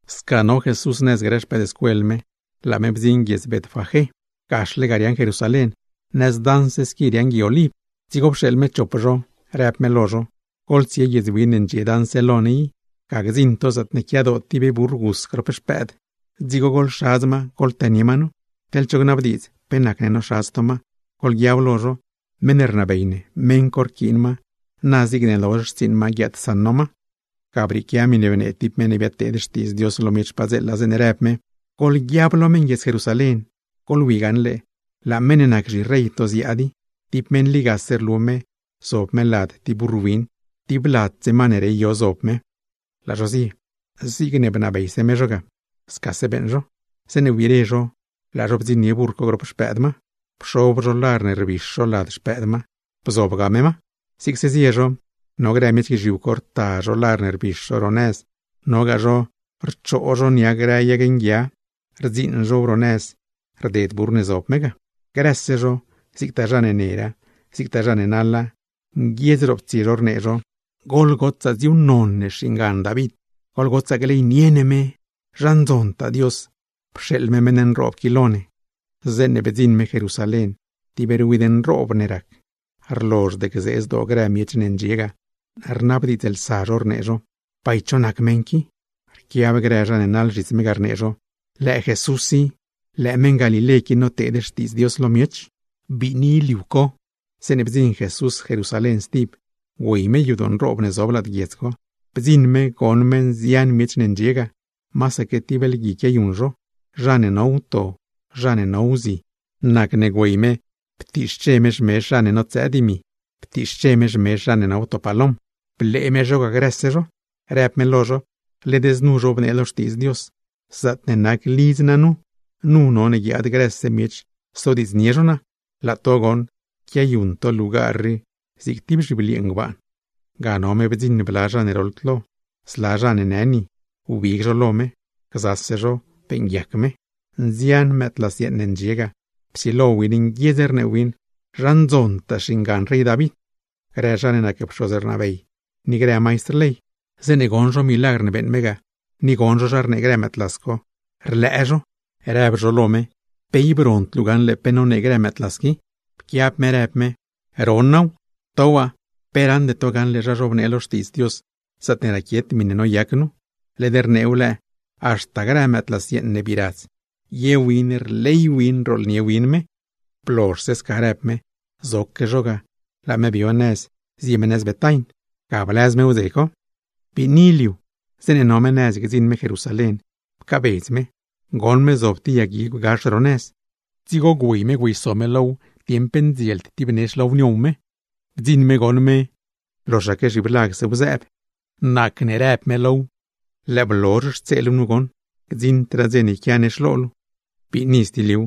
Sca no Jesús nëz grë xpëëdscuel me, laa me bdziṉ guiedz Betfagé. Gaxle ga riaaṉ Jerusalén, nëz daṉse squi riaaṉ Gui Oliv. Dzigo pxeeḻ me chop xpëëdscuel me, rëb me lo zho: ―Goḻtsie guiedz win ne ndxie daṉse lo ne i. Ga gdziṉ to zaatne quiadoo tib burr gus grop xpëëd, dzigo goḻxadz ma goḻtënie ma nu. Teḻ cho gnabdiidz pe nacne noxadz to ma, goḻguiab lo zho: Meṉ ne rnabey ne, meṉ co rquiin ma, na zigne lozh xtsiiṉ ma guiaadsaṉ no ma. Ga brieequia miṉe bnee tib meṉ ne biadteed xtiidz Dios lo miech padzeela, zeeṉe rëb me: Goḻguiab lo meṉ Jerusalén: “Goḻwi gaṉle, laa meṉ ne nac zhirey to ziaad i. Tib meṉ ligase rlu me, zob me lad tib burr win, tib ladse ma ne rey yo zob me.” Laa zho zie, zigne bnabeyse me zho ga, scase beeṉ zho. Zeeṉe wbire zho, laa zho bdziṉnie burr co grop xpëëd ma. Pxob zho lar ne rbix zho lad xpëëd ma, laa me bzob ma. Zigse zie me, no grë miech guizhiu co, rta zho lar ne rbix zho ro nëz rded burr ne zob me ga; nogaa zha ne rchoo nia grë yag nguia, rdziiṉ zhow ro nëz rded me. Grëse zho, zigtaa zha ne nera, zigtaa zha ne naḻa, nguiedz roptsie zho rnee zho: ―¡Goḻgotsaa co ne xviv xingan David! ¡Goḻgotsaa gleynie ne me! ¡Zha ndzontaa Dios, pxeeḻ me meṉ nroob qui lo ne! Zeeṉe bdziṉ me Jerusalén, rlozhd gzee zdoo grë miech ne ndxie ga, rnabdiidzlsa zho rnee zho: ―¿Bay cho nac meṉ qui? Rquiab grë zha ne naḻ zhits me ga, rnee zho: ―¡Lëë Jesús i! ¡Lëë meṉ Galilé qui, noteed xtiidz Dios lo miech! Biini liu co, zeeṉe bdziṉ Jesús Jerusalén stib, güey me yadoo nroob ne zob lad guiedz co. Bdziṉ me goṉ me nzian miech ne ndxie ga, masaque tib lgui quiayuṉ zho, zha ne no wto, zha ne no wzi. Nacne güey me ptiixche me xmezh zha ne notsëë dimi, ptiixche me xmezh zha ne no wto palom; blee me zho ga grëse zho, rëb me lo zho: ―Led znu goṉ zhobnee lo Xtiidz Dios: “Zaatne nac lidz naa nu, nu none guiaad grëse miech sodiidznie zho naa.” Laa to goṉ, quiayuṉ to lugar rii zig tib zhibliee ngbaan. Ga no me bdziṉ bla zha ne roḻd lo, zla zha ne në ni, wbig zho lo me. Gzase zho beeṉguiac me. Nzian mëëdlas yeeṉ ne ndxie leṉ yadoo ga, psilo win nguiedz rnee win: “¡Zha ndzontaa xingan rey David!” Grë zha ne nac pxoz ne rnabey, ni grë maistr ley, zeeṉe goṉ zho milagr ne beeṉ me ga, ni goṉ zho zha rnee grë mëëdlas co, rlëë zho, rëb zho lo me: ―¿Pe ib rond luu gaṉle pe nonee grë mëëdlas qui? Pquiab me rëb me: ―Ron naaw. ¿To waa, pe raṉde to gaṉle zha zhobnee lo Xtiidz Dios, zaatne raquiet miṉe noyac nu? Led rneew lëë: Haxta grë mëëdlas ne bii radz, ye win rley win rooḻnie win me. Blozhse sca rëb me, zoque zho ga, laa me bio nëz zie me nëz Betain. Ga blëz me wdze co. Sil co zeeṉe no me nëz gdziṉ me Jerusalén, pcaabedz me. Goṉ me zob tib yag guigw gax ro nëz, dzigo güey me güeyso me low dieṉ pe ndzield tib nex low niow me. Bdziṉ me goṉ me loxaque zhiblagsew zëëb, nacne rëb me low: ―¡Lëë blozh xtse luu nu goṉ! ¡Gdziṉdraa dze ne yquia nex lo luu! Biini liu,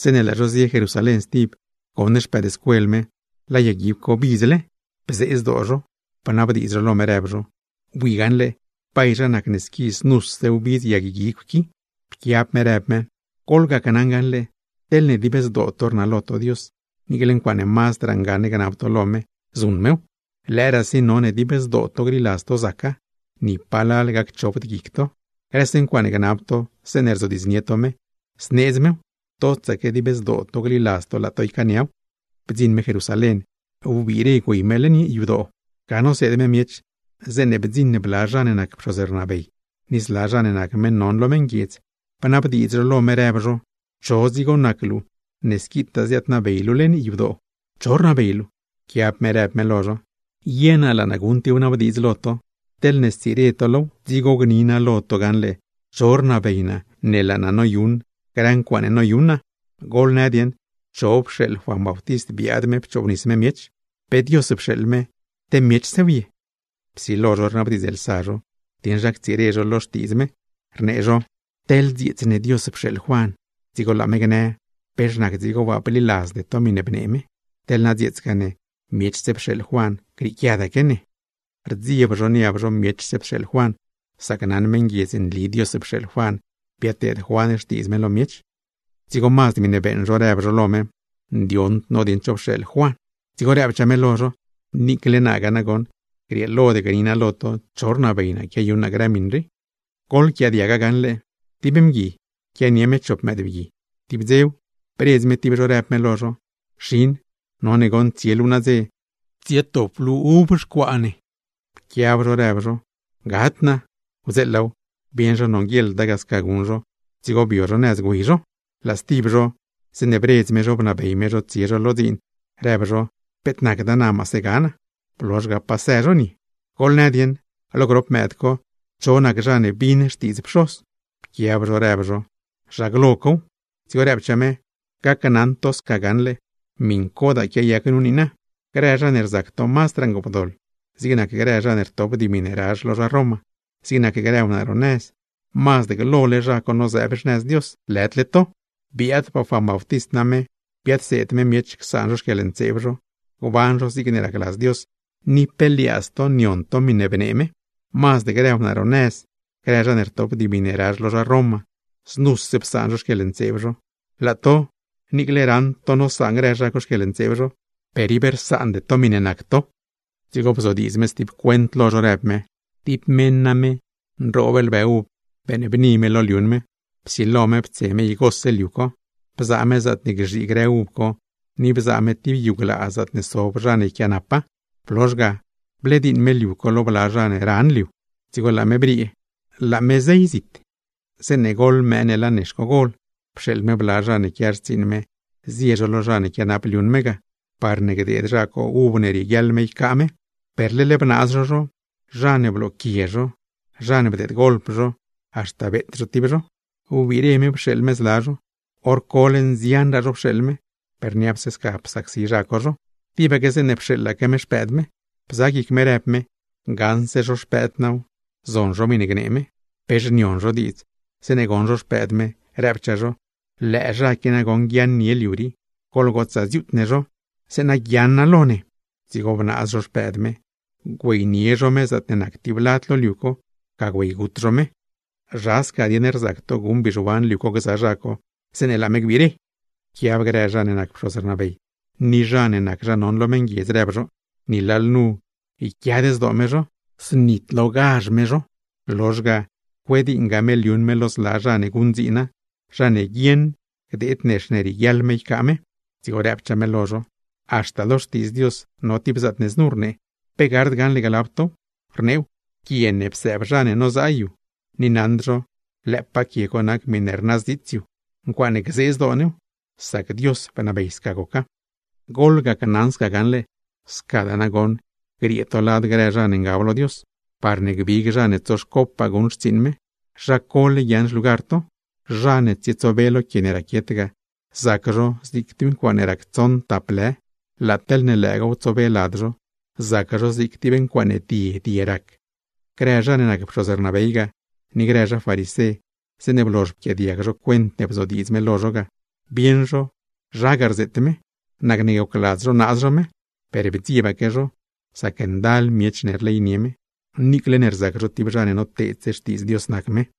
zeeṉe laa zho zie Jerusalén stib, goṉ xpëëdscuel me, laa yag guigw co bidzle. Bzee zdoo zho, bnabdiidz zho lo me rëb zho: ―¿Bui gaṉle, bay zha nacne squi znuse wbidz yag guigw qui? Pquiab me rëb me: ―Gneli naa lo to gaṉle, teḻne dib zdoo to rnalo to Dios, niicle ncuaaṉe mazdraa ngaṉ gnab to lo me, zuṉ mew. Lëëraasi none dib zdoo to gliladz to zaca, ni palal gacchopd guic to. Grëse ncuaaṉe gnab to zeeṉe rzodiidznie to me, zneedz mew, totsaque dib zdoo gliladz to laa to ycaaniaw. Bdziṉ me Jerusalén, wbiire güey me leṉ yadoo. Ga noseed me miech, zeeṉe bdziṉ bla zha ne nac pxoz ne rnabey ni zla zha ne nac meṉ non lo meṉguiedz, bnabdiidz zho lo me rëb zho: ―¿Cho dzigo nac luu ne squitaa ziaadnabey luu leṉ yadoo? ¿Cho rnabey luu? Pquiab me rëb me lo zho: ―Ye naa laa naa guṉ tib wnabdiidz lo to. Teḻne stsire to low, dzigo gni naa lo to gaṉle cho rnabey naa ne laa naa noyuṉ grë ncuaaṉe noyuṉ naa. Goḻnë dieṉ, ¿cho pxeeḻ Juan Bautist biaad me pchoobnis me miech? ¿Pe Dios pxeeḻ me, te miechsew ye? Psilo zho rnabdiidzlsa zho dieṉ zha ctsire zho lo xtiidz me, rnee zho: ―Teḻne dzieets ne Dios pxeeḻ Juan, dzigo laa me gnë: “¿Pex nac dzigo waa bliladzde to miṉe bnee me?” Teḻ na dzieetsgaa ne, miechse pxeeḻ Juan, grieequiadaque ne. Rdzieb zho niab zho miechse pxeeḻ Juan, sac naṉ meṉguiedz nli Dios pxeeḻ Juan biadteed Juan xtiidz me lo miech. Dzigo mazd miṉe beeṉ zho rëb zho lo me: ―Ndioṉd no dieṉ cho pxeeḻ Juan. Dzigo rëbchaa me lo zho: ―Niicle naagaa nagoṉ, grieelod gni naa lo to cho rnabey naa quiayuṉ naa grë miṉ rii. ’Goḻquiaadiaga gaṉle. Tib mgui, quianie me chop mëëdbgui. Tib dzew, bredz me tib zho rëb me lo zho: “Xin, none goṉ tsie luu nadze, tsietop luu uv xcuaa ne.” Pquiab zho rëb zho: “¡Gad naa!” Wdzeelaaw, bieṉ zho nonguieḻda ga sca guṉ zho, dzigo bio zho nëz güey zho. Laa stib zho, zeeṉe bredz me zho bnabey me zho tsie zho lo dziin, rëb zho: “Peet nacda, na maase ga naa.” Blozh ga pasë zho nie. ’Goḻnë dieṉ, lo grop mëëd co, ¿cho nac zha ne bin xtiidz pxoz? Pquiab zho rëb zho: ―Zha glo cow. Dzigo rëbchaa me: ―Gneli naa lo to gaṉle, miṉcodaa quiayac nu niina: Grë zha ne rzac to mazdraa ngoopdoḻ, zig nac grë zha ne rtop dimi ne razh lo zha Roma, zig nac grë wnaa ro nëz, mazd glole zha co nozëëb xnëz Dios, lëdle to. Biaadpaa Juan Bautist name biadseed me miech csaan zho xquieḻntseeb zho, gban zho zigne racladz Dios, ni pe liaadz to nion to miṉe rnee me. Mazd grë wnaa ro nëz, grë zha ne rtop dimi ne razh lo zha Roma, znuse psaan zho xquieḻntseeb zho. Laa to, niicle raṉ to nosaan grë zha co xquieḻntseeb zho, per ib rsaande to miṉe nac to. Dzigo bzodiidz me stib cuent lo zho rëb me: ―Tib meṉ name, nroob lbë uv beeṉbni me lo liuṉ me. Psilo me ptse me igose liu co, bzaa me zaatne gzhii grë uv co, ni bzaa me tib yu glaa zaatne sob zha ne yquiaanapa. Blozh ga, blediiṉ me liu co lo bla zha ne ran liu, dzigo laa me briee, laa me zey zit. ’Zeeṉe goḻ mëë ne laa nex co gol, pxeeḻ me bla zha ne quia xtsiiṉ me zie lo zha ne quianap liuṉ me ga, parne gdeed zha co uv ne rieguiaḻ me ycaa me. Per leḻ bnaaz zho zho, zha ne blooquie zho, zha ne bdeedgolp zho, haxta beet zho tib zho. Wbiire pxeeḻ me zla zho, hor cole nzianraa zho pxeeḻ me, per niapse sca psacsi zha co zho. ’Tibaque zeeṉe pxeeḻaque me xpëëd me, bza guic me rëb me: “Gaṉse zho xpëëd naaw, zon zho miṉe gnee me.” ’Pex nion zho diidz, zeeṉe goṉ zho xpëëd me, rëbchaa zho: “¡Lëë zha qui nagoṉ guiaaṉnie liu rii! ¡Goḻgotsaa dziuut ne zho, zeeṉa guiaaṉa lo ne!” Dzigo bnaaz zho xpëëd me, güeynie zho me zaatne nac tib lad lo liu co, ga güeygut zho me. ’¿Zha sca dieṉ rzac to guṉ bizhuan liu co gza zha co, zeeṉe laa me gbire? Pquiab grë zha ne nac pxoz ne rnabey, ni zha ne nac zha non lo meṉguiedz ga, rëb zho: ―Ni lalnu yquiad zdoo me zho, znitlogazh me zho. Lozhse ga, cuediiṉga me liuṉ me lo zla zha ne guṉdziina, zha ne guieṉ gdeed nex ne rieguiaḻ me ycaa me. Dzigo rëbchaa me lo zho: ―Haxta lo Xtiidz Dios no tib zaatne znu rnee, ¿pe gard gaṉle glab tow? Rneew: Quie ne psëëb zha ne nozaa yu, ni naṉd zho lëëpaa quie co nac miṉe rnazdziits yu. ¡Ncuaaṉe gzee zdoo new! Sac Dios bnabey sca goca. ’Gacnaṉ to gaṉle, scadaa nagoṉ griee to lad grë zha ne ngab lo Dios, parne gbig zha ne tsoxcopaa guṉ xtsiiṉ me, zha cole guiaaṉ xlugar to. Zha ne tsietsobe lo quie ne raquiet ga, zac zho zig tib ncuaaṉe rac tsoṉ tap lë; laa teḻ lëëgaaw tsobe lad zho, zac zho zig tib ncuaaṉe die die rac. Grë zha ne nac pxoz rnabey ga, ni grë zha farisé, zeeṉe blozh pquiaadiag zho cuent ne bzodiidz me lo zho ga, bieṉ zho zha ga rzeet me. Nacne gocladz zho naaz zho me, per bdziebaque zho; sac ndal miech rleynie me, niicle ne rzac zho tib zha ne noteedse xtiidz Dios nac me.